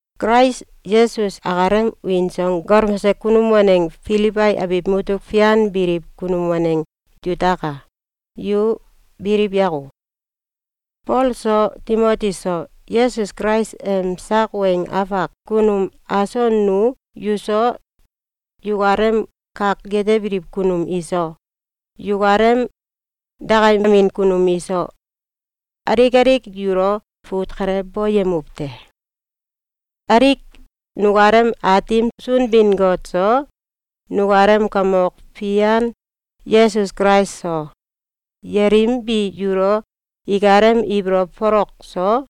Kulais Yesus akalem wiin so galmose kunum waneng Filibai abiw mutuk fian biliw kunum waneng yutaka! Yu biliw yako! Fol so, Timoti so, Yesus Kulais em sak weng afak kunum aso nu yuso, yukalem kak yetebiliw kunum iso, yukalem dakayemin kunum iso, alik alik yulo fut kale boyemuw te. Alik nukalem Aatim Sunbin-Got so, nukalem Kamok Fian Yesus Kulais so, yelim bi yulo ikalem ibolow folok so,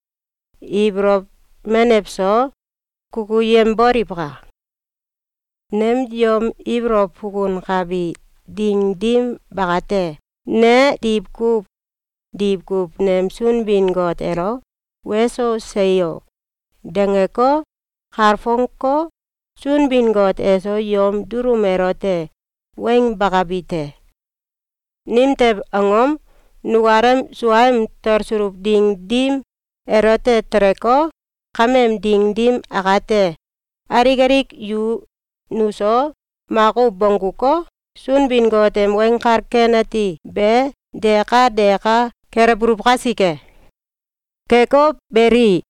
ibolow menew so, kukuyemboliwka! Nem yom ibolow fukunkabi ding dim bakate, ne diwkuw diwkuw nem Sunbin-Got elo “Weso! Seyo!”, dangeko, kalfongeko, Sunbin-Got eso yom dulum elote weng bakabi te. Nimtew angom? Nukalem suaem talsuluw ding dim elote teleko, kameem ding dim akate, alik alik yu nuso makuw bongguko, Sunbin-Got em Weng Kal Ken Ati be deka deka kelewbuluw kasike. Keko beli,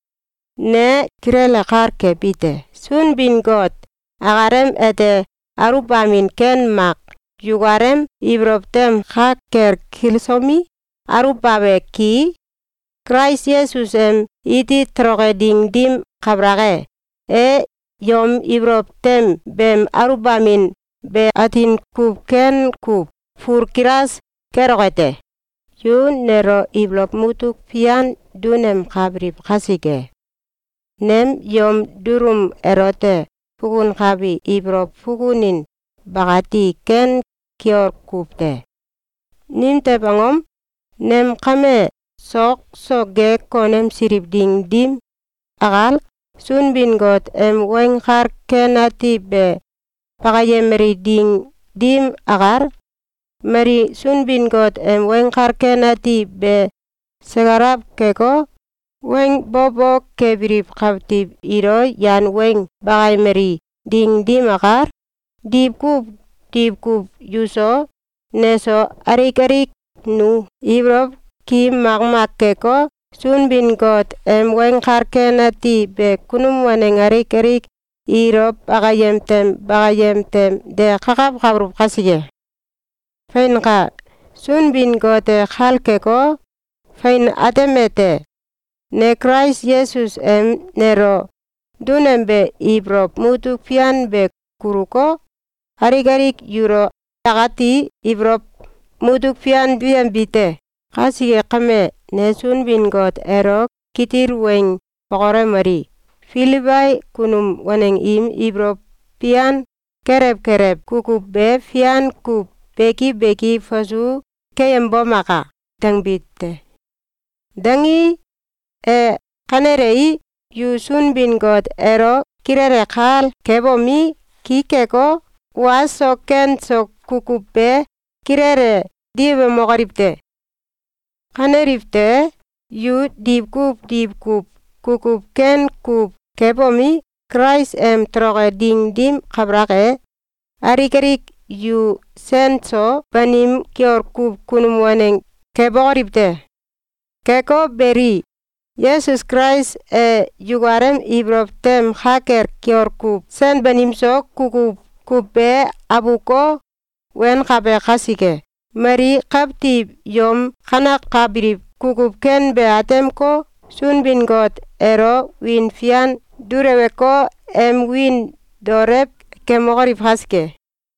ne kilele kal kebite: Sunbin-Got akalem ete aluwbamin ken mak yukalem ibolow tem ka kel kilsomi, aluwbabe ki, Kulais Yesus em iti toloke ding dim kabalak e, e yom ibolow tem beem aluwbamin be atin kuw ken kuw fulkilas keloke te. Yu nelo ibolow mutuk fian dunemkabiliw kasike, nem yom dulum elote fukunkabi ibolow fukunin bakati ken kiol kuw te. Nimtew angom? Nem kame sok so ge konemsiliw ding dim akal, Sunbin-Got em Weng Kal Ken Ati be bakayemali ding dim akal, mali Sunbin-Got em Weng Kal Ken Ati be sakalaw keko, weng bo bo kebiliw kawtiw ilo yan weng bakayemali ding dim akal, diwkuw diwkuw yuso, neso, alik alik nu ibolow ki makmak keko, Sunbin-Got em Weng Kal Ken Ati be kunum waneng alik alik ilo bakayem tem bakayem tem de kakawkabuluw kasike. Feinka! Sunbin-Got e kal keko, fein atemete: Ne Kulais Yesus em nelo dunembe ibolow mutuk fian be kuluko, alik alik yulo akati ibolow mutuk fian duyembi te. Kasike kame, ne Sunbin-Got elo kitil weng bokolewomeli: “Filibai kunum waneng im ibolow fian kelew kelew kukuw be fian kuw beki beki fasu keyembomaka!”, dangbi te. Dangii, e kanelei, yu Sunbin-Got elo kilele kal kebomi, ki keko, wa so ken so kukuw be kilele diwemokoliw te. Kaneliw tewe, yu diwkuw diwkuw kukuw ken kuw kebomi, Kulais em toloke ding dim kabalak e, alik alik yu sen so banim kiol kuw kunum waneng kebokoliw te. Keko beli, Yesus Kulais e yukalem ibolow tem ka kel kiol kuw sen banimso kukuw kuw be abuko, wenkabe kasike, mali kawtiw yom kanekabiliw kukuw ken be atemeko, Sunbin-Got elo wiin fian duleweko, em wiin daolew kemokoliw kasike.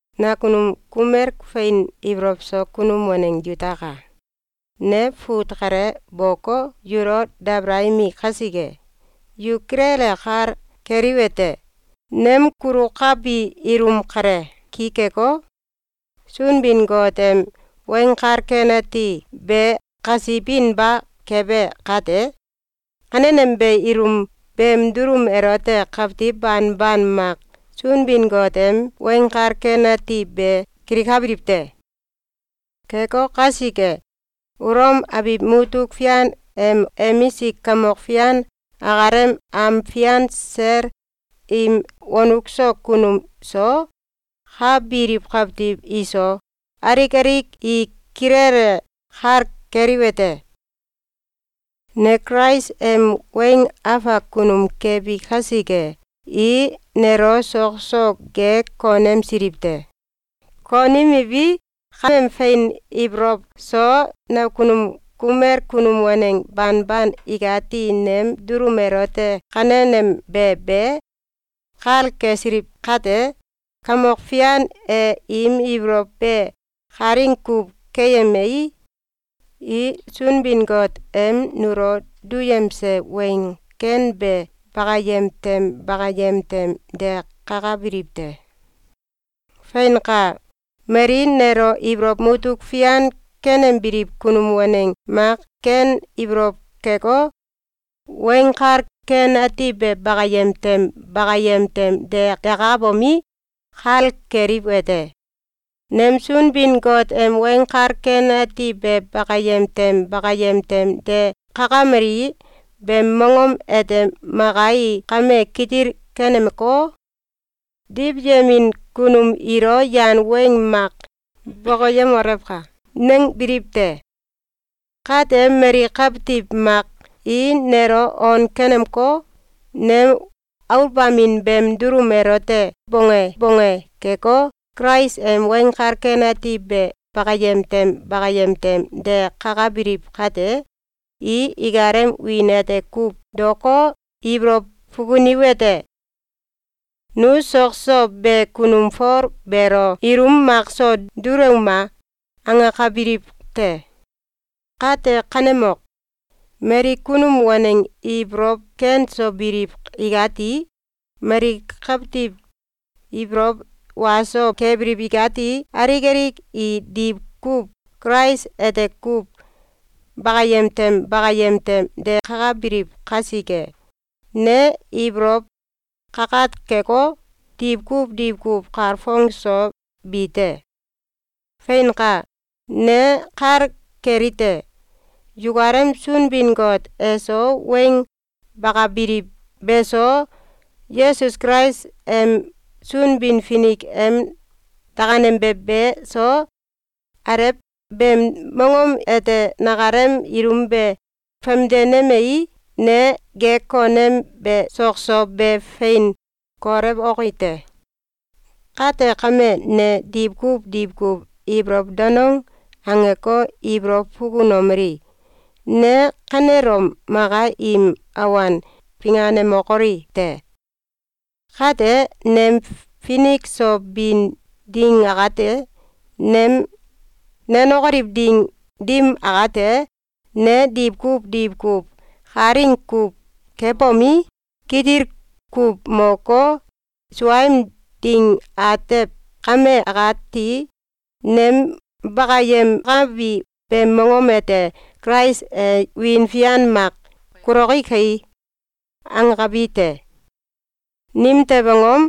Nakunum kumel fein ibolow so kunum waneng yutaka! Ne fut kale boko, yulo dabalayemi kasike, yu kilele kal keliwete: Nem kulukabi ilum kale ki keko, Sunbin-Got em Weng Kal Ken Ati be kasibinba kebe kate, kanenembe ilum beem dulum elote kawtiw banban mak Sunbin-Got em Weng Kal Ken Ati be kilikabiliw te. Keko kasike, Ulom abiw mutuk fian em emisik kamok fian akalem am fian sel im wonuk so kunum so, ka biliw kawtiw iso, alik alik i kilele kal keliwete: Ne Kulais em weng afak kunum kebi kasike, i nelo sok so ge konemsiliw te. Konemiwi, kaem fein ibolow so nakunum kumel kunum waneng banban ikati nem dulum elote kanenembe be kal kesiliw kate, Kamok Fian e im ibolow be kalaing kuw keyemei, i Sunbin-Got em nulo duyemse Weng Ken be bakayem tem bakayem tem de kakabiliw te. Feinka! Mali nelo ibolow mutuk fian kenembiliw kunum waneng mak ken ibolow keko, Weng Kal Ken Ati be bakayem tem bakayem tem de kakabomi, kal keliwete: Nem Sunbin-Got em Weng Kal Ken Ati be bakayem tem bakayem tem de kakamali beem mongom ete maka i kame kitil kenemeko, “Diwyemin kunum ilo yan weng mak bokoyemolewka!”, nangbiliw te. Kate, mali kawtiw mak i nelo on kenemeko, nem aluwbamin beem dulum elote bonge bonge keko, Kulais em Weng Kal Ken Ati be bakayem tem bakayem tem de kakabiliw kate, i ikalem wiin ete kuw daoko, ibolow fukuniwete: ‘Nu sok so be kunum Fol beelo ilum makso dulewuma!’, angakabiliw te. Kate, kanemok! Mali kunum waneng ibolow ken so biliw ikati, mali kawtiw ibolow wa so kebiliw ikati, alik alik i diwkuw Kulais ete kuw bakayem tem bakayem tem de kakabiliw kasike, ne ibolow kakat keko, diwkuw diwkuw kalfong so bi te. Feinka! Ne kal kelite: Yukalem Sunbin-Got eso weng bakabiliw be so, Yesus Kulais em Sunbin-Finik em dakanembe be so, alew beem mongom ete nakalem ilum be famdenemei, ne ge konembe sok so be fein kolewoki te. Kate kame, ne diwkuw diwkuw ibolow danong angeko, ibolow fukunomeli: “Ne kanelom maka im awan finganemokoli te! Kate, nem finik so bin ding akate, nem nenokoliw ding dim akate, ne diwkuw diwkuw kalaing kuw kebomi, kitil kuw moko, suaem ding atew kame akati, nem bakayemkabi beem mongom ete Kulais e wiin fian mak kuloke kai!”, angakabi te. Nimtew angom?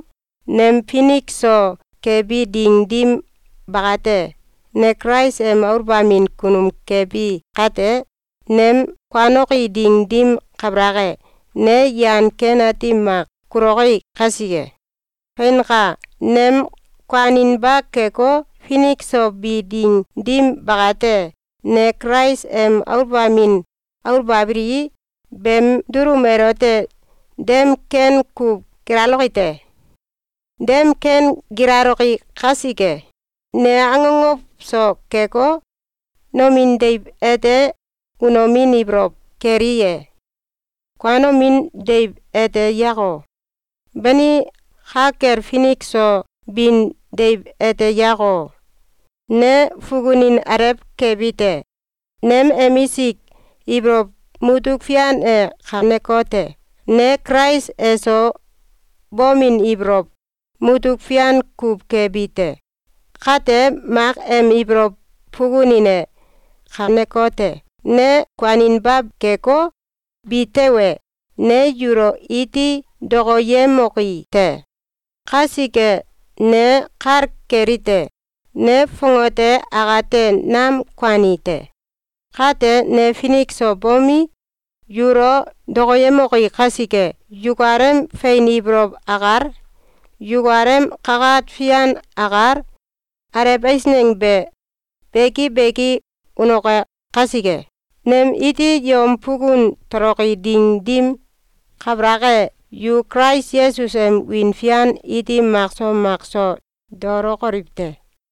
Nem finik so kebi ding dim bakate, ne Kulais em aluwbamin kunum kebi kate, nem kuanoki ding dim kabalak e, ne yan ken ati mak kuloki kasike. Feinka! Nem kuaninba keko, finik so bi ding dim bakate, ne Kulais em aluwbamin aluwbabilii, beem dulum elote dem ken kuw gilaloke te. Dem ken gilaloke kasike, ne akokow so keko, nomin deiw ete unomin ibolow keli ye? Kuanomin deiw ete yako? Bani, ka kel finik so bin deiw ete yako? Ne fukunin alew kebite. Nem emisik ibolow mutuk fian e kanekote: Ne Kulais eso bomin ibolow mutuk fian kuw kebi te. Kate, mak em ibolow fukunin e kanekote: Ne kuaninba keko, bi tewe, ne yulo iti dokoyemoki te. Kasike, ne kal kelite: Ne fongate akate nam kuani te. Kate, ne finik so bomi, yulo dokoyemoki kasike, yukalem fein ibolow akal, yukalem kakat fian akal, alew eisneng be beki beki unoke kasike, nem iti yom fukun toloki ding dim kabalak e, yu Kulais Yesus em wiin fian iti makso makso daolokoliw te.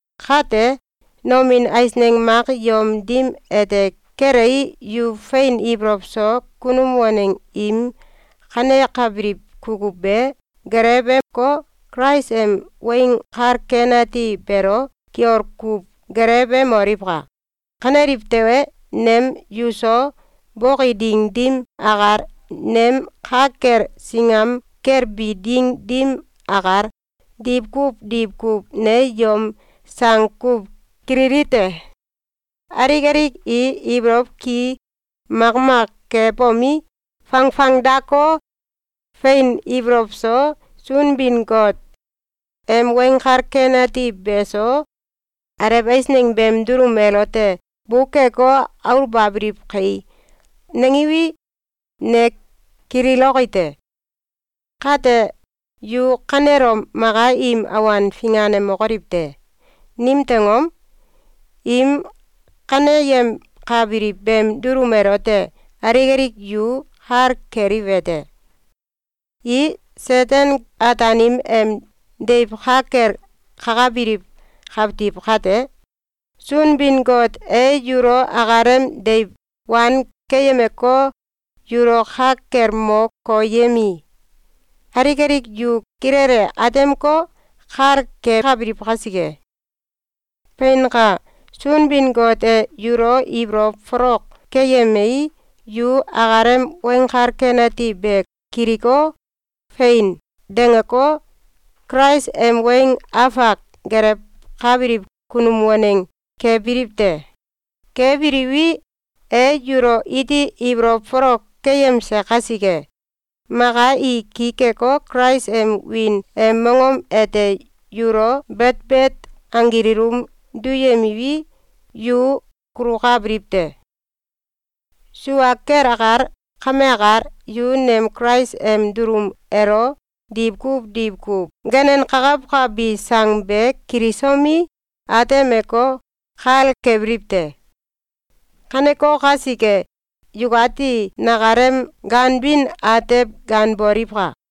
Kate, nomin eisneng mak yom dim ete kelei, yu fein ibolow so kunum waneng im kanekabiliw kukuw be geleweko, Kulais em Weng Kal Ken Ati beelo kiol kuw gelewemoliwka! Kaneliw tewe, nem yuso boki ding dim akal, nem ka kel singam kel bi ding dim akal, diwkuw diwkuw ne yom sang kuw kililite: “Alik alik i ibolow ki makmak kebomi, fangfangdako, fein ibolow so, Sunbin-Got em Weng Kal Ken Ati beso, alew eisneng beem dulum elote bukeko, aluwbabiliw kai!”, nangiwi, ne kililoki te. Kate, yu kanelom maka im awan finganemokoliw te! Nimtew angom? Im kaneyemkabiliw beem dulum elote alik alik yu kal keliwete: I Seten-Ataanim em deiw ka kel kakabiliw kawtiw kate, Sunbin-Got e yulo akalem deiw wan keyemeko, yulo ka kel mo koyemei, alik alik yu kilele atemeko, kal kekabiliw kasike. Feinka! Sunbin-Got e yulo ibolow folok keyemei, yu akalem Weng Kal Ken Ati be kiliko, “Fein!”, dangeko, Kulais em weng afak gelewkabiliw kunum waneng kebiliw te. Kebiliwi, e yulo iti ibolow folok keyemse kasike, maka i ki keko, Kulais em wiin em mongom ete yulo betbet anggil ilum duyemiwi, yu kulukabiliw te. Sua kel akal kame akal, yu nem Kulais em dulum elo diwkuw diwkuw ganenkakawkabi sang be kilisomi, atemeko, kal kebiliw te. Kaneko kasike, yukati nakalem ganbin atew ganboliwka!